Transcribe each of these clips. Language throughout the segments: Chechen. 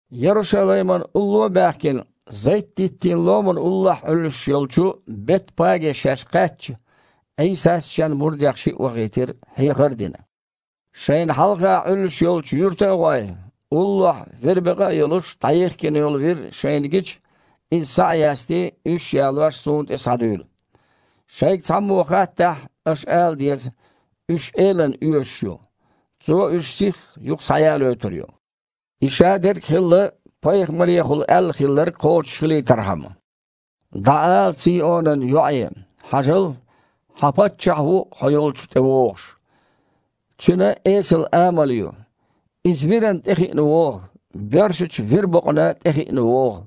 Ярушалаймана улло а баьхкина, Зайт-диттийн ломана уллохь Іуьллуш йолчу Бет-Паге шаьш кхаьчча, Іийсас Шен мурдех шиъ вахийтира, хьехар а дина: «Шайна хьалха Іуьллуш йолчу юьрта а гІой, уллохь вирбекъа а йолуш, дІайихкина йолу вир шайна гича, иза схьа а ястий, уьш а ялош, Суна тІе схьадуьйла. Шайга цхьаммо хаттахь, аша ала деза: „Уьш Элана оьшуш ю. Цо уьш сихха юха схьаялайойтур ю“». И шадерг а хилла пайхамарехула аьлла хилларг кхочушхилийтархьама: «Цийон-ломан йоІе алийша: „Хьажал хьан Паччахь ву хьо йолчу тІевогІуш! Цуьнан эсала амал ю. Иза вирана тІехиъна вогІу, боьршачу вирбокъана тІехиъна вогІу!“»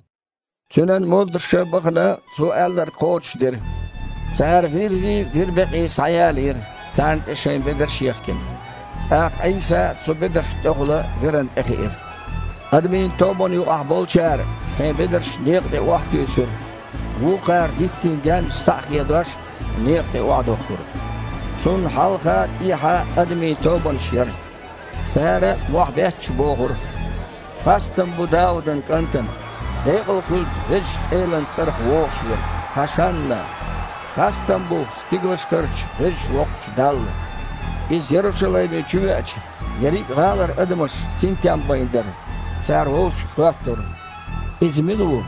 Цуьнан мурдаша, бахана, Цо аьлларг кхочушдира. Цара виррий, вирбекъий схьаялийра, царна тІе шайн бедарш а ехкина. ТІаккха Іийса цу бедаршна тІехула вирана тІехиира. Адамийн тобанна юкъахь болчара шайн бедарш некъа тІе охьатуьйсура, вукхара диттийн гаьннаш, схьа а хедош, некъа тІе охьадохкура. Цунна хьалха а, тІехьа а адамийн тобанаш яра. Цара, мохь а бетташ, бохура: «Хастам бу Даудан КІантана! Декъал хуьлда Везачу Элан цІарах вогІуш Верг! ХІашанна! Хастам бу стигалшкарчу Веза Воккхачу Далла!» Иза Ярушалайме чувеача, ерриг а гІалара адамаш синтем байна дара, цара вовшашка хоьттура: «Иза мила ву?»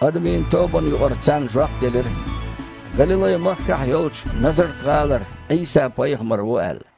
Адамийн тобанна юкъара царна жоп делира: «Галилай-махкахь йолчу Назарт-гІалара Іийса-пайхамар ву», – аьлла.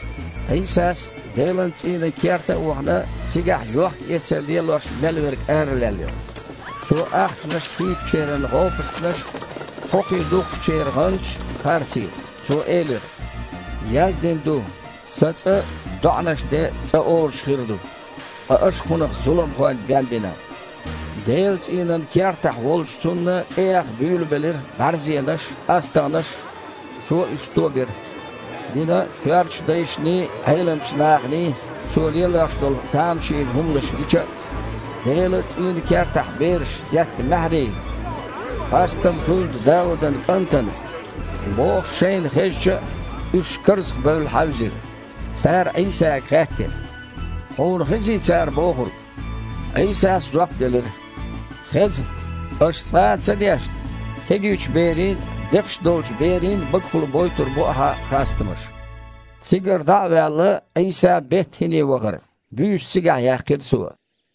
Іийсас, Делан цІийнан керта а вахана, цигахь йохкаэцар лелош мел верг аралаьллира. Цо ахчанаш хуьйцучеран гІопастанаш а, кхокхий духкучеран гІанташ а харцийра. Цо элира: «Яздина ду: „Сан ЦІа доІанан цІа хир ду“. Ткъа аша кхунах „зуламхойн бен“ бина». Делан цІийнан кертахь волчу Цунна тІеэха буьйлабелира бІаьрзенаш, астагІнаш. Цо уьш тобира. Динан коьртачу дайшний, Іеламчу наханий Цо лелош долу тамашийна хІуманаш гича а, Делан цІийнан кертахь бераша детта маьхьарий: «Хастам хуьлда Даудан КІантана!» – бохуш шайна хезча а, уьш карзахбевлла хьаьвзира. Цара Іийсага хаьттира: «Хьуна хезий цара бохург?» Іийсас жоп делира: «Хеза. Аша цкъа а ца дешна: „Кегийчу берийн а, декхаш долчу берийн а багахула бойтур бу Ахьа хастамаш“?» Цигара дІа а ваьлла, Іийса Бет-ХІине вахара. Буьйса цигахь яьккхира Цо.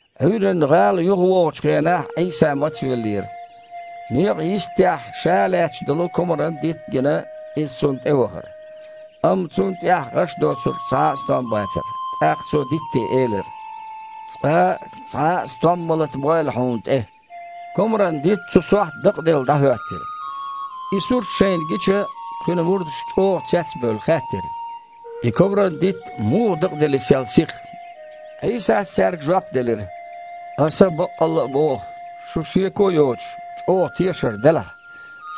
Іуьйранна гІала юхавогІучу хенахь Іийса мацвеллера. Некъан йистехь ша лаьтташ долу комаран дитт а гина, Иза цунна тІевахара. Амма цунна тІехь, гІаш доцург, цхьа а стом бацара. ТІаккха Цо дитте элира: «Цкъа а цхьа а стом ма латабойла хьуна тІе!» Комаран дитт цу сохьта дакъаделла дІахІоьттира. И сурт шайна гича, Кхуьнан мурдаша, чІогІа цец а бевлла, хаьттира: «И комаран дитт муха дакъадели сел сиха?» Іийсас цаьрга жоп делира: «Аса баккъалла а боху: шун, шеко а йоцуш, чІогІа тешар делахь,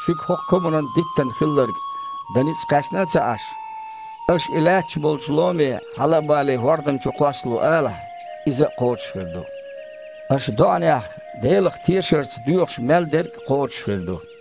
шуьга хІокху комаран диттана хилларг дан ницкъ кхаьчна а ца Іаш, аша и лаьтташ болчу ломе: „Хьала а балий, хІордана чу кхоссало“, – алахь, иза а кхочуш хир ду. Аша доІанехь Делах тешарца доьхуш мел дерг а кхочуш хир ду».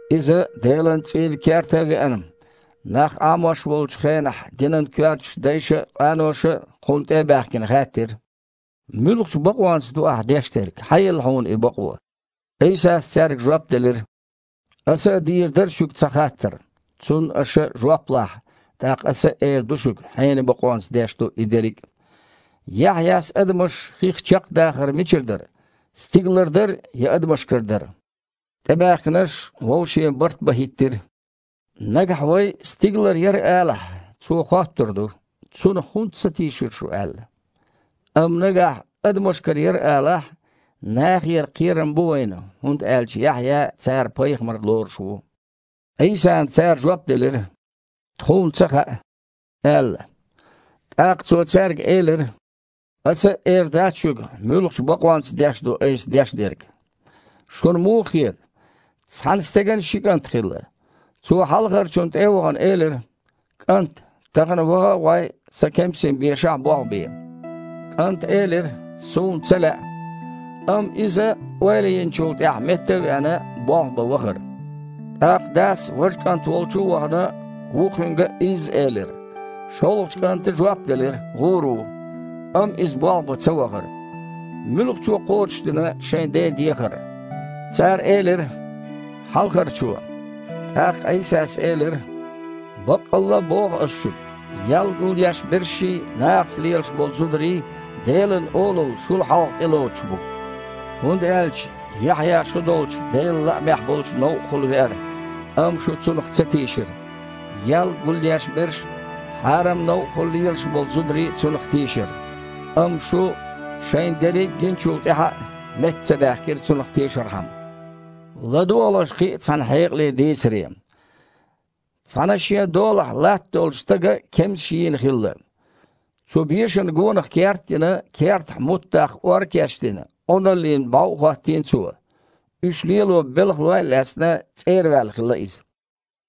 Иза, Делан цІийнан керта а веана, нах Іамош волчу хенахь динан коьртачу дайша а, къаноша а, Кхунна тІе а баьхкина, хаьттира: «Муьлхачу бакъонца ду Ахь деш дерг? Хьан елла Хьуна и бакъо?» Іийсас цаьрга жоп делира: «Аса а дийр дара шуьга цхьа хаттар. Цунна аша жоп лахь, тІаккха Аса а эр ду шуьга, хьенан бакъонца деш ду и дерриг а. Яхьъяс адамаш хих чекхдахар мичара дара? Стигалара дара я Адамашкара дара?» ТІебаьхкинарш вовше барт бан хІиттира: «Нагахь вай: „Стигалара яра“, алахь, Цо хоттур ду: „Цунах хІунда ца тийшира шу?“ – аьлла. Амма нагахь: „Адамашкара яра“, – алахь, нахера кхерам бу вайна, хІунда аьлча Яхьъя цара пайхамар лоруш ву». Іийсана цара жоп делира: «Тхуна ца хаьа», – аьлла. ТІаккха Цо цаьрга элира: «Ас а эр дац шуьга, муьлхачу бакъонца деш ду Айса деш дерг». «Шуна муха хета? Цхьана стеган ши кІант хилла. Цо, хьалхарчунна тІе а вахана, элира: „КІант, тахана ваха а гІой, сан кемсийн бешахь болх бе“. КІанта элира: „Суна ца лаьа“. Амма иза, ойла йинчу тІаьхьа метта а веана, болх бан вахара. ТІаккха дас, важа кІант волчу а вахана, вукхуьнга а изза элира. ШолгІачу кІанта жоп делира: „ГІур ву“. Амма иза болх бан ца вахара. Муьлхачо кхочушдина шайн ден дехар?» Цара элира: «Хьалхарчо». ТІаккха Іийсас элира: «Баккъалла а боху Аса шуьга: ял гулъешбершший, нахаца лелаш болу зударий Делан Олалла шул хьалха тІелоцуш бу. ХІунда аьлча Яхьъя шу долчу Делан лаамехь болчу новкъахула веара, амма шу цунах ца тийшира. Ял гулъешберш а, хьарам новкъахула лелаш болу зударий а цунах тийшира. Амма шу, шайна дерриг а гиначул тІаьхьа а, метта ца даьхкира цунах тешархьама». «ЛадогІалаш кхин а цхьана хьекъалечу дийцаре. Цхьана шен долахь латта долчу стага кемсаш йийна хилла. Цу бешана гонах керт а йина, кертахь мутт даккха ор а кечдина, Іуналлина бІов а хІоттийна цо. Уьш лело белхалой а лаьцна, цІера ваьлла хилла иза.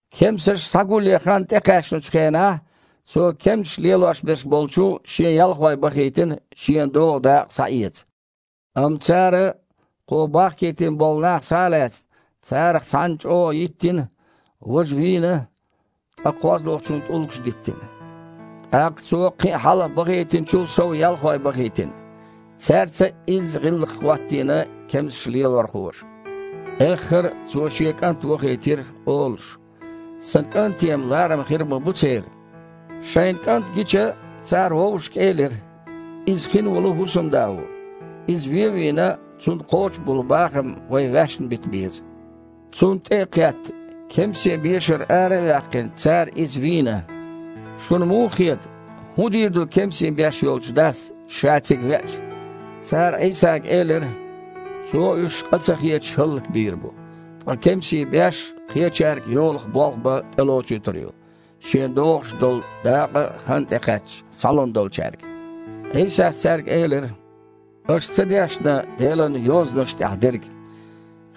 Кемсаш схьагулъян хан тІекхаьчначу хенахь, цо кемсаш лелош берш болчу шен ялхой бахийтина шена догІу дакъа схьаэца. Амма цара, кхо бахкийтина болу нах схьа а лаьцна, царах цхьанна чІогІа йиттина, важа вийна, ткъа кхозлагІниг, тІулгаш диттина. ТІаккха цо кхин а хьалха бахийтинчул сов ялхой бахийтина. Цаьрца а изза „гІиллакх“ хІоттийна кемсашлелорхоша. Эххар а цо шен кІант вахийтира, олуш: „Сан кІанте-м ларам хир ма бу церан“. Шайна кІант гича, цара вовшашка элира: „Иза хин олу хІусамда ву. Иза вен а вийна, цунна кхочу болу бахам вай ваьшна бита беза“. Цунна тІе а кхетта, кемсийн бешара иза ара а ваьккхина, цара иза вийна. Шуна муха хета, хІун дийр ду кемсийн беш йолчу дас, ша цига веача?» Цара Іийсага элира: «Цо уьш, къа ца хеташ, хІаллакбийр бу, ткъа кемсийн беш кхечаьрга йолах болх бан тІелоцуьйтур ю, шена догІуш долу дакъа, хан тІекхаьчча, схьалун долчаьрга». Іийсас цаьрга элира: «Аша ца дешна Делан Йозанашна тІехь дерг: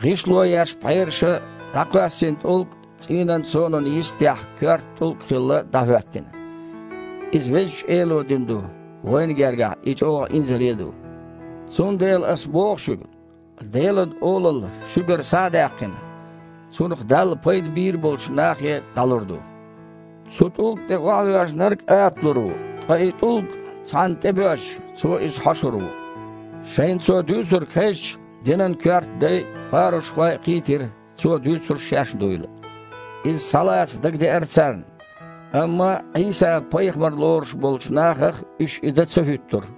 „ГІишло еш пхьераша дІакхоьссина тІулг цІийнан сонан йистехь коьрта тІулг, хилла, дІахІоьттина. Иза Везачу Элера ду, вайна гергахь и чІогІа инзаре а ду!“ Цундела Аса боху шуьга: Делан Олалла, шуьгара схьа а даьккхина, цунах Далла пайда бийр болчу нахе дІалур ду. Цу тІулга тІе охьавоьжнарг аталур ву, ткъа и тІулг цхьанна тІебоьжча, цо иза хьошур ву». Шайна Цо дуьйцург хезча, динан коьрта дай а, парушхой а кхийтира, Цо дуьйцурш шаьш дуйла. Иза схьалаца дагадеара царна, амма Іийса пайхамар лоруш болчу нахах уьш и дан ца хІуьттура.